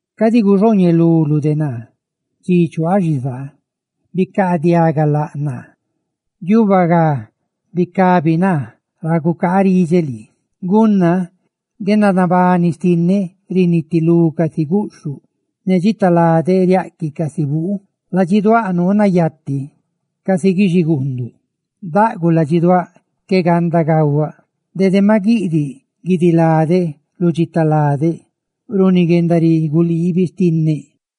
Cadi guxooñeluluꞌ naa dxi chuaaꞌ xizaa; ¡bicaadiaga laꞌ naa!, ¡guiuba ga bicabi naa ra gucaaridxeꞌ lii! Gunna guendanabani xtinneꞌ rinitilú casi guꞌxhuꞌ, ne dxitaladeꞌ riaꞌquiꞌ casi buu, ladxiduáꞌ nuu nayati casi guixiguunduꞌ; ¡daꞌguꞌ ladxiduáꞌ, qué ganda gahuaꞌ! Dede maꞌ guiꞌdiꞌ guidiladeꞌ lu dxitaladeꞌ runi guendariguu liibi xtinneꞌ.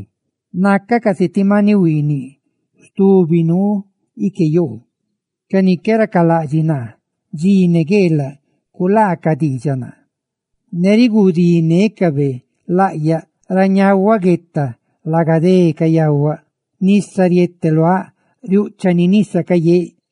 Qué raseꞌ. Nacaꞌ casi ti maniꞌ huiiniꞌ stubi nuu ique yoo. Ca ni qué racalaꞌdxiꞌ naa dxi ne gueelaꞌ culaacaꞌ diidxaꞌ naa, ne riguudinécabe laꞌyaꞌ. Ra ñahuaꞌ gueta, laga dé cayahuaꞌ; nisa riete luáꞌ, riúꞌchani nisa cayeeꞌ,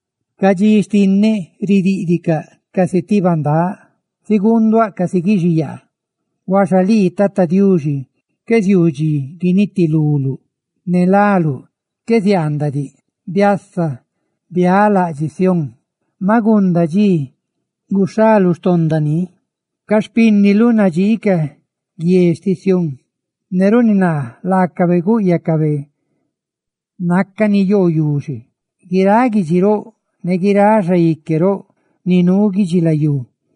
Ca dxi xtinneꞌ ridíꞌdicaꞌ casi ti bandáꞌ; ziguunduáꞌ casi guixiyaa. Hauxa lii, Tata Diuxi, qué ziuu dxi guinitiluluꞌ; ¡ne láluꞌ qué ziaandaꞌ diꞌ! Biasa, bialaꞌdxiꞌ Sión, maꞌ gunda dxi; ¡dxi guxhaluꞌ xtonda ni! Ca xpínniluꞌ nadxiicaꞌ guie xtiꞌ Sión; ne riuubaꞌ laacabe gúꞌyacabe nácani yoo yuxe. Guiráꞌ guidxi roꞌ ne guiráꞌ xaique roꞌ ni nuu guidxilayú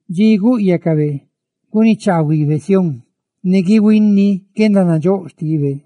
dxi gúꞌyacabe gunichaahuibe Sión, ne guihuini guendanandxóꞌ xtibe,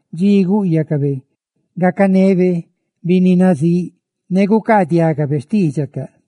dxi gúꞌyacabe gacanebe binni nazíꞌ, ne gucaadiagabe xtídxicaꞌ.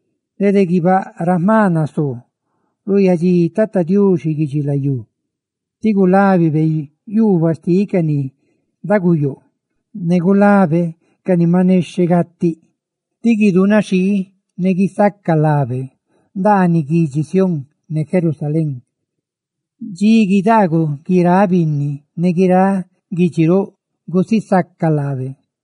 Dede guibáꞌ ra jma nasoo, ruuyadxi Tata Diuxi guidxilayú diꞌ, tí gulábibe yuubaꞌ xtiꞌ ca ni daguyoo ne gulabe ca ni maꞌ nexheꞌ gatiꞌ; tí guidunaxhii ne guisaca lábe ndaaniꞌ guidxi Sión, ne Jerusalén, dxi guidaaguꞌ guiráꞌ binni ne guiráꞌ guidxi roꞌ gusisacaꞌ laabe.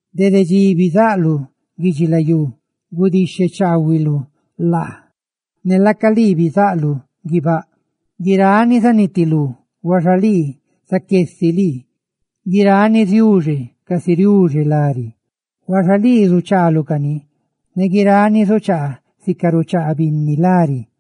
Dede dxi bizaꞌluꞌ guidxilayú gudixhechaahuiluꞌ laa; ne laaca lii bizaꞌluꞌ guibáꞌ. Guirani zanitilú, huaxa lii zaqué si lii. Guirani ziuxe, casi riuxe lari; ¡huaxa lii zuchaaluꞌ cani ne guirani zuchaa, sica ruchaa binni lari!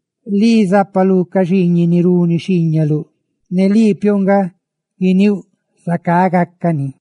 Lii zápaluꞌ ca xiiñiꞌ ni runi xhiiñaluꞌ; ne lii piouꞌ nga guiníuꞌ zacá gácani.